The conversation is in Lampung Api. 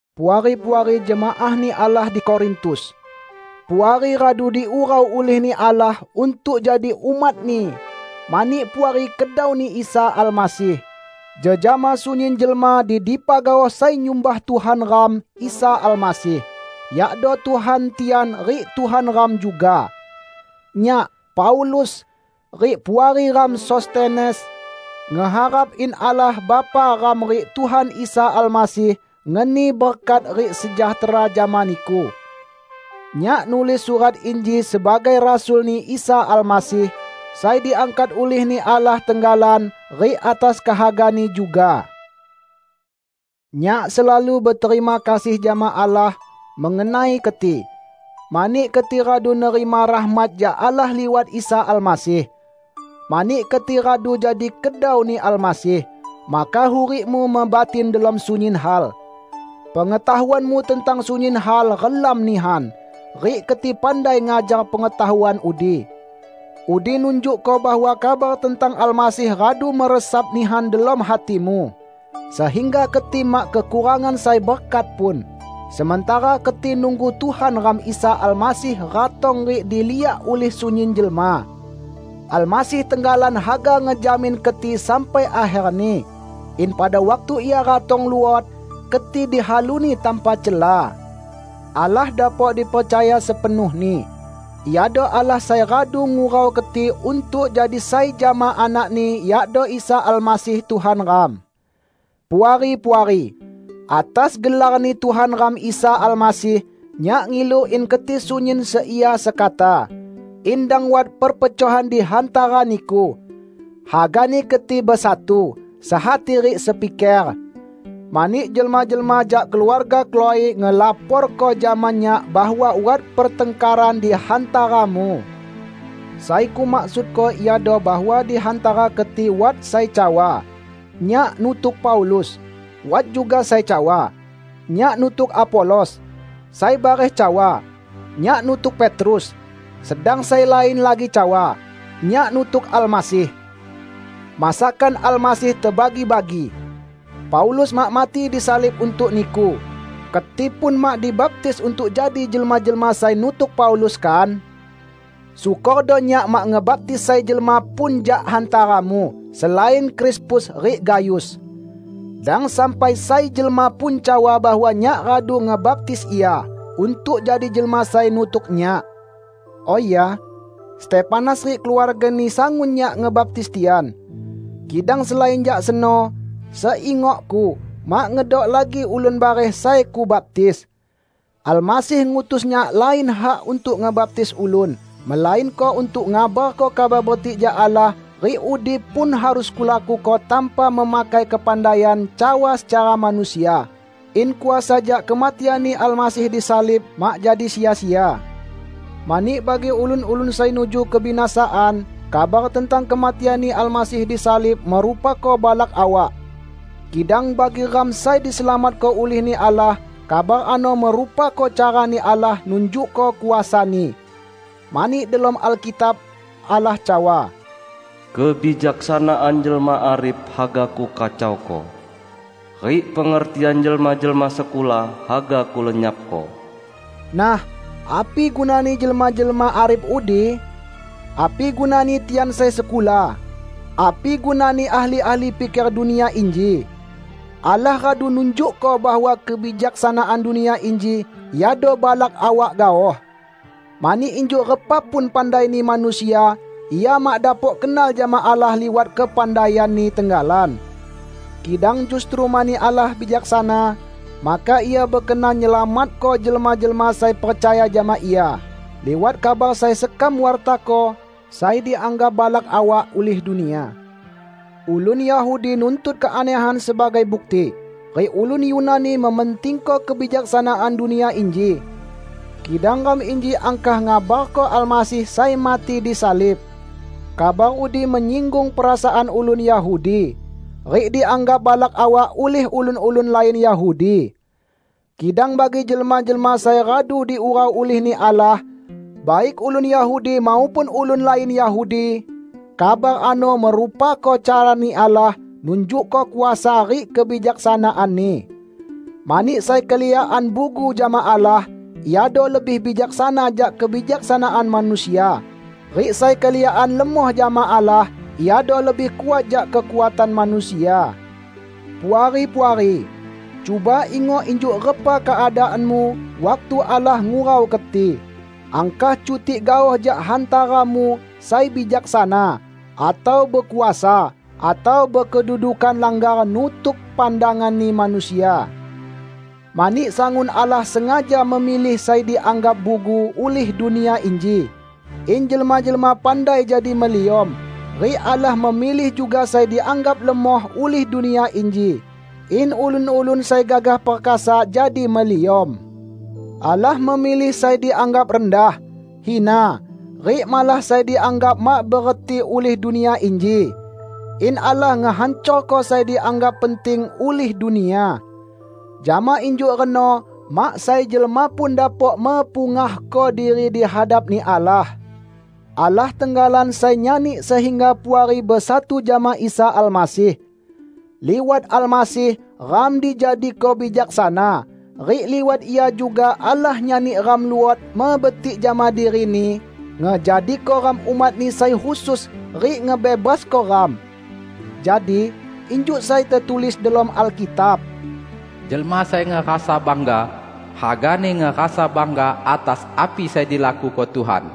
Puari-puari jemaah-Ni Allah di Korintus! Puari radu diurau ulih-Ni Allah untuk jadi umat-Ni mani Puari kedau-Ni Isa Almasih, jejama sunyin jelma di dipa gaoh sai nyumbah Tuhan ram Isa Almasih, yakdo Tuhan tian rik Tuhan ram juga. Nyak, Paulus, rik puari ram Sostenes, ngeharap in Allah Bapa ram rik Tuhan Isa Almasih ngeni berkat rik sejahtera jama niku. Nyak nulis surat inji sebagai Rasul-Ni Isa Almasih, sai diangkat ulih-Ni Allah tenggalan rik atas kehaga-Ni juga. Nyak selalu beterima kasih jama Allah mengenai keti, mani keti radu nerima rahmat jak Allah liwat Isa Almasih. Mani keti radu jadi kedau-Ni Almasih, maka hurikmu mebatin delom sunyin hal. Pengetahuanmu tentang sunyin hal relam nihan, rik keti pandai ngajar pengetahuan udi. Udi nunjukko bahwa kabar tentang Almasih radu meresap nihan delom hatimu, sehingga keti mak kekurangan sai berkat pun, sementara keti nunggu Tuhan ram Isa Almasih ratong rik diliak ulih sunyin jelma. Almasih tenggalan haga ngejamin keti sampai akherni; in pada waktu Ia ratong luot, keti dihaluni tanpa cela. Allah dapok dipercaya sepenuhni. Iado Allah sai radu ngurau keti untuk jadi sai jama Anak-Ni, yakdo Isa Almasih, Tuhan ram. Puari-puari! Atas gelar-Ni Tuhan ram Isa Almasih, nyak ngilu in keti sunyin seia sekata; in dang wat perpecohan di hantara niku. Hagani keti besatu, sehati rik sepiker. Mani, jelma-jelma jak keluarga Klo"e ngelaporko jama nyak bahwa wat pertangkaran di hantaramu. Sai kumaksudko iado bahwa di hantara keti wat sai cawa, "Nyak nutuk Paulus," wat juga sai cawa, "Nyak nutuk Apolos," sai bareh cawa, "Nyak nutuk Petrus," sedang sai lain lagi cawa, "Nyak nutuk Almasih." Masakan Almasih tebagi-bagi! Paulus mak mati disalib untuk niku! Keti pun mak dibaptis untuk jadi jelma-jelma sai nutuk Paulus, kan? Syukordo nyak mak ngebaptis sai jelma pun jak hantaramu, selain Krispus rik Gayus. Dang sampai sai jelma pun cawa bahwa nyak radu ngebaptis ia untuk jadi jelma sai nutuk nyak. ( Oh ya, Stefanas rik keluargani, sangun nyak ngebaptis tian. Kidang selain jak seno, seingokku, mak ngedok lagi ulun bareh sai kubaptis.) Almasih ngutus nyak lain hak untuk ngebaptis ulun, melainko untuk ngabarko Kabar Betik jak Allah; rik udi pun harus kulakuko tanpa memakai kepandaian cawa secara manusia, in kuasa jak kematian-Ni Almasih di salib mak jadi sia-sia. Mani bagi ulun-ulun sai nuju kebinasaan, kabar tentang kematian-Ni Almasih di salib merupako balak awak. Kidang, bagi ram sai diselamatko ulih-Ni Allah, kabar ano merupako carani Allah nunjukko kuasa-Ni. Mani delom Alkitab, Allah cawa, "Kebijaksanaan jelma arif haga Kukacauko, rik pengertian jelma-jelma sekula haga Kulenyapko." Nah, api gunani jelma-jelma arif udi? Api gunani tian sai sekula? Api gunani ahli-ahli piker dunia inji? Allah radu nunjukko bahwa kebijaksanaan dunia inji iado balak awak gaoh. Mani injuk repa pun pandaini manusia, ia mak dapok kenal jama Allah liwat kepandaianni tenggalan. Kidang justru mani Allah bijaksana, maka Ia bekenan nyelamatko jelma-jelma sai percaya jama Ia liwat kabar sai sekam wartako sai dianggap balak awak ulih dunia. Ulun Yahudi nuntut keanehan sebagai bukti, rik ulun Yunani mementingko kebijaksanaan dunia inji. Kidang ram inji angkah ngabarko Almasih sai mati disalib. Kabar udi menyinggung perasaan ulun Yahudi, rik dianggap balak awak ulih ulun-ulun lain Yahudi. Kidang bagi jelma-jelma sai radu diurau ulih-Ni Allah -- baik ulun Yahudi maupun ulun lain Yahudi -- kabar ano merupako carani Allah nunjukko kuasa rik kebijaksanaan-Ni. Mani sai keliakan bugu jama Allah, iado lebih bijaksana jak kebijaksanaan manusia; rik sai keliakan lemoh jama Allah, iado lebih kuat jak kekuatan manusia. Puari-puari! Cuba ingok injuk repa keadaanmu waktu Allah ngurau keti. Angkah cutik gaoh jak hantaramu sai bijaksana, atau bekuasa, atau bekedudukan langgar nutuk pandanganni manusia. Mani sangun Allah sengaja memilih sai dianggap bugu ulih dunia inji, in jelma-jelma pandai jadi meliom. Rik Allah memilih juga sai dianggap lemoh ulih dunia inji, in ulun-ulun sai gagah perkasa jadi meliom. Allah memilih sai dianggap rendah, hina, rik malah sai dianggap mak bereti ulih dunia inji, in Allah ngehancorko sai dianggap penting ulih dunia. Jama injuk reno mak sai jelma pun dapok mepungahko diri di hadap-Ni Allah. Allah tenggalan sai nyani sehingga Puari besatu jama Isa Almasih. Liwat Almasih, ram dijadiko bijaksana. Rik liwat Ia juga Allah nyani ram luot mebetik jama diri-Ni, ngejadiko ram umat-Ni sai khusus, rik ngebebasko ram. Jadi, injuk sai tetulis delom Alkitab, "Jelma sai ngerasa bangga, hagani ngerasa bangga atas api sai dilakuko Tuhan."